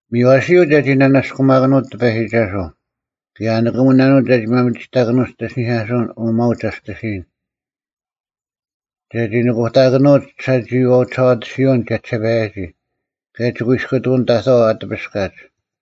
ᒥᔽᓯᔪᐤ ᒐᒋ ᓂᓇᔅᑯᒪᑭᓄᐅᑦ ᑎᐸᔨᒋᒐᓱᐤ, ᑭᔭ ᐊ ᓂᑭᒧᓇᓄᐅᒡ ᒐᒋ ᒪᒥᒋᑕᑭᓄᐅᒡ ᒋᑦ ᐃᓯᓂᐧᑲᓱᐅᓐ, ᐅ ᒪᐅᒡ ᒋᔅᑎᓯᔨᓐ: ᒐᒋ ᓄᑯᑕᑭᓄᐅᒡ ᒋᓴᒋᐃᐛᐤ ᒋᓴᐛᑎᓯᐅᓐ ᒋᔭᒋᓴᐸᔭᒋ, ᑭᔭ ᒋᑯᐃᔅᑯᑐᐅᓐ ᑕᑥᐤ ᐊ ᑎᐱᔅᑲᒡ: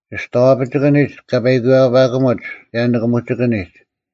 ᒋᔍᐛᐱᒋᑭᓂᒡ ᑲ ᐸᐃᑯᔪᐛᐸᑲᒧᒡ, ᑭᔭ ᓂᑭᒧᒋᑭᓂᒡ;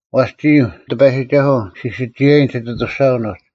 ᐛᔅ ᒋᔾ, ᑎᐸᔨᒋᒐᓱᐤ, ᔅᒋ ᓯᒋᔭᐃᓐ ᒋᑦ ᐊᑐᔅᒐᐅᓐ ᐅᒡ: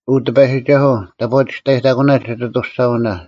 ᐅ ᑎᐸᔨᒋᒐᓱᐤ, ᑕᑈ ᒋᔅᑕᔨᑕᑯᓇ ᒋᑦ ᐊᑐᔅᒐᐅᓇ!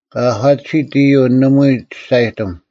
ᑲ ᐊᒂᑎᓯᑦ ᐃᔪᐤ ᓇᒪᐎᔾ ᒋᔅᒐᔨᑎᒻ;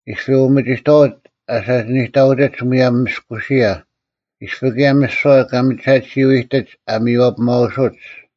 ᐃᔅᐱ ᐅᒥᒋᑥᐅᒡ ᐊ ᓴᒋᓂᑕᐅᒋᒡ ᒧᔭᒻ ᒥᔅᑯᓯᔭ, ᐃᔅᐱ ᑭᔭ ᒥᓯᐛ ᑲ ᒥᒐᑎᓯᐤ ᐃᑎᒡ ᐊ ᒥᔽᐱᒪᐅᓯᒡ;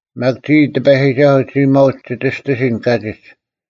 ᒪᒃ ᒋᔾ, ᑎᐸᔨᒋᒐᓱᐤ, ᒋ ᒪᐅᒡ ᒋ ᒋᔅᑎᓯᓐ ᑲᒋᒡ᙮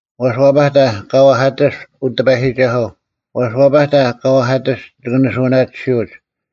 ᐛᔅ, ᐛᐸᑕ, ᑲ ᐛᐧᑲᑎᔅᒡ, ᐅ ᑎᐸᔨᒋᒐᓱᐤ, ᐛᔅ, ᐛᐸᑕ ᑲ ᐛᐧᑲᑎᔅᒡ ᒋᑭ ᓂᓱᐅᓇᑎᓯᐅᒡ;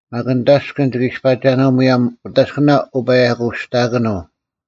ᒪᒃ ᓂᑦ ᐊᔅᑭᓐ ᒋᑭ ᐃᔅᐸᒐᓄᐤ ᒧᔭᒻ ᐅᑦ ᐊᔅᑭᓇ ᐅᐸᔭᑯᑕᔅᑭᓄᐤ: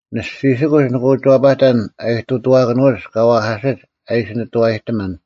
ᓂᔅᒋᓯᑯᒡ ᓂᒋ ᐅᒋ ᐛᐸᑕᓐ ᐊ ᐃᑐᑐᐛᑭᓄᐅᒡ ᑲ ᐛᐧᑲᓯᒡ ᐊ ᐃᓯ ᓂᑐᐛᔨᑎᒪᓐ,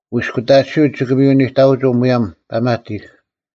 ᐅᑯᐃᔅᑯᑕᑎᓯᐤ ᒋᑭ ᒥᔪ ᓂᑕᐅᒍᐤ ᒧᔭᒻ ᐸᒪᑎᒄ;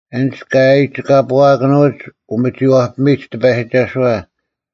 ᐊᓐᒡ ᑲ ᐊᔨᒋᑲᐳᐊᑭᓄᐅᒡ ᐅᒥᒋᐛᐱᒥᔨᒡ ᑎᐸᔨᒋᒐᓱᐛ,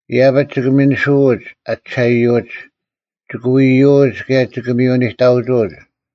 ᐃᔭᐱᒡ ᒋᑭ ᒥᓂᓱᐅᒡ ᐊ ᒋᓴᐃᔪᐅᒡ; ᒋᑭ ᐎᔨᔪᐅᒡ ᑭᔭ ᒋᑭ ᒥᔪ ᓂᑕᐅᒋᐅᒡ;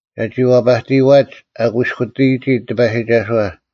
ᒐᒋ ᐛᐸᑎᔨᐛᒡ ᐊ ᑯᐃᔅᑯᑎᔨᒋ ᑎᐸᔨᒋᒐᓱᐛ: